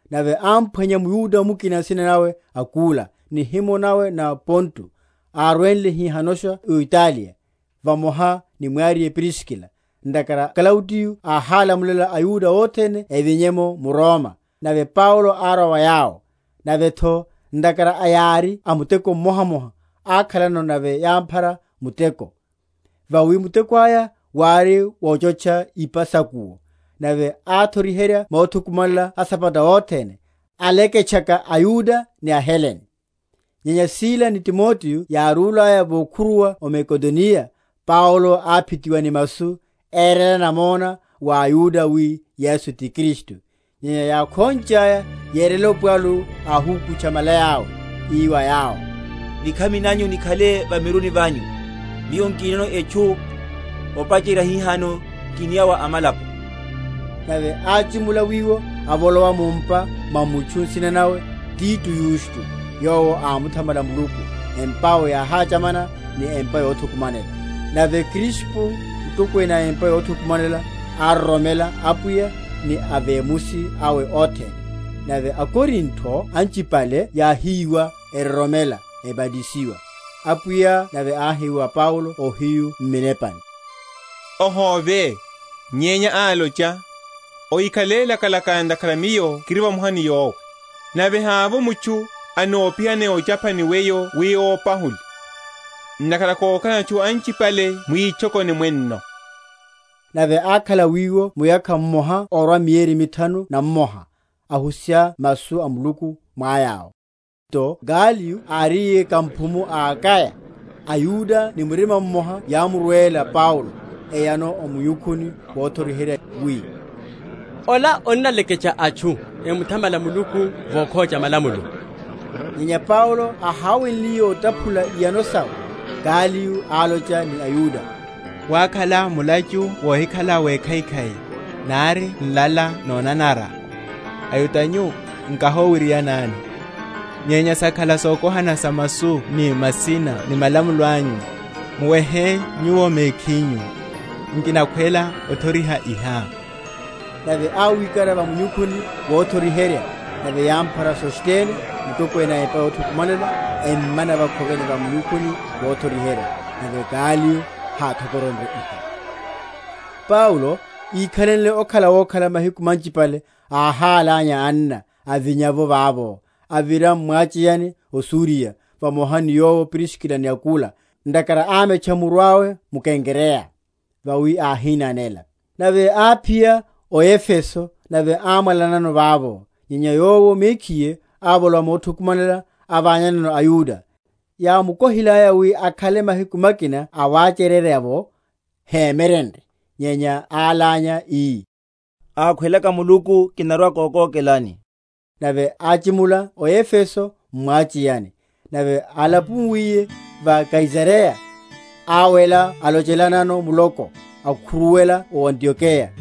Nave ámphwanya mYuda mukina nsina nawe Akula, nihimo nawe nó Ponto, arwenle hihanosha o Italiya, vamoha ni mwariye Priskila, ntakhara Klaudiyo áhálamulela aYuda othene evinye’mo m’Roma; nave Paulo árwa wa yawo: nave’tho ntakhara ári a muteko mmohamoha, ákhalano, nave yáphara muteko; vawi muteko aya wári wochotcha ipa sa’kuwo. Nave áthoriherya mothukumanela asabata othene, aleke?-?tchaka aYuda ni aHelene. Nyenya Sila ni Timoteo yárulaya vokhuruwa o Makedoniya, Paulo áphitiwa ni masu, érela namona wa aYuda wi Yesu ti Kristu. Nyenya yákhonchaya, yerela opwalu, áhukutcha malaya’we, ii wa yawo, Nikhami nanyu nikhale va miruni vanyu; miyo nkinono etchu, opacherya hihano kiniya wa amalapo. Nave áchimula wiwo, avolowa mu’mpa mwa mutchu, nsina nawe Tito Yusto, yowo ámuthamala Muluku, empa’we yáhachamana ni empa yothukumanela. Nave Krispo, mutokwene a empa yothukumanela ároromela Apwiya ni avemusi awe othene; nave aKorinto anchipale yáhíwa, eroromela, ebatisiwa. Apwiya nave áhi wa Paulo ohiyu m’minepani, Ohóve, nyenya locha, ohikhale lakalaka; ntakhara Miyo kiri vamoha ni yowe, nave havo mutchu anopihane ochapha ni weyo wi ópahule; ntakhara kokhalano atchu anchipale mwitchokoni mwenno. Nave ákhala wiwo muyakha mmoha orwa mieri mithanu na mmoha; ahusiha masu a Muluku mwa yawo. Nto Galiyo áriye kamphumu a Akaya, aYuda ni murima mmoha yámurwela Paulo, eyano o munyukhuni wothoriherya, wi, Ola onnaleketcha atchu emuthamale Muluku vokhocha malamulo. Nyenya Paulo áháweliye otaphula iyano sawe, Galiyo álocha ni aYuda, Wakhala mulachu wohikhala wekhaikhai, nari nlala nonanara, aYuda nyu, nkahowirianani: nyenya sakhala sokohana sa masu ni masina ni malamulo anyu; muwehe nyuwo mekhinyu; nkinakhwela othoriha iha. Nave áwikara va munyukhuni wothoriherya. Nave yámphara Sostene, mutokwene a empa yothukumanela, emmana vakhoveni va munyukhuni wothoriherya. Nave Galiyo háthokoronrye iha. Paulo, ikhalenle okhala wokhala mahiku manchipale áhálanya anna, avinya’vo vavo, avira m’mwacheyani o Suriya, vamoha ni yowo Priskila ni Akula; ntakhara ámetcha muru awe m’Kenkreya; vawi áhinanela. Nave áphiya o Efeso, nave ámwalanano vavo: nyenya yowo mekhiye ávolowa mothukumanela, avanyanano aYuda. Yámukohilaya wi akhale mahiku makina awachererya’vo, hémyerenrye; nyenya álánya, ii, Akhwelaka Muluku, kinarwa‐kokókelani; nave áchimula o Efeso m’mwacheyani. Nave álapuwaliye va Kaisareya, áwela alochelanano muloko, akhuruwela o Antiokeya.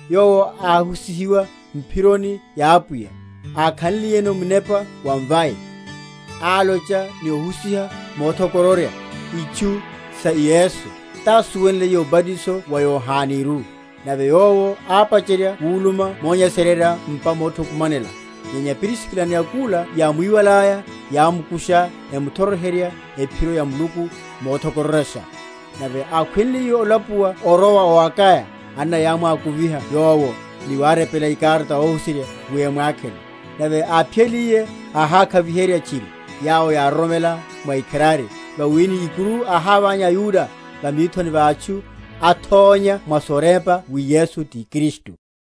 Yowo áhusihiwa m’phironi ya Apwiya; ákhanliyeno munepa wa mvai, álocha ni ohusiha mothokororya itchu sa Yesu, tásuwenle obatiso wa Yohaneru: nave yowo ápacherya wuluma monyesererya m’mpa mothukumanela, nyenya Priskila ni Akula yámwiwalaya, yámukusha, emuthoriherya ephiro ya Muluku mothokororyasha. Nave ákhweliye olapuwa orowa o Akaya, anna yámwakuviha yowo, ni warepela ikarata óhuserya wi emwakhele: nave áphiyaliye, áhákhaviherya tchiri yawo yároromela mwa ikharari; vawi ni ikuru áhávanya aYuda, va mithoni va atchu, athónya mwa sorepa wi Yesu ti Kristu.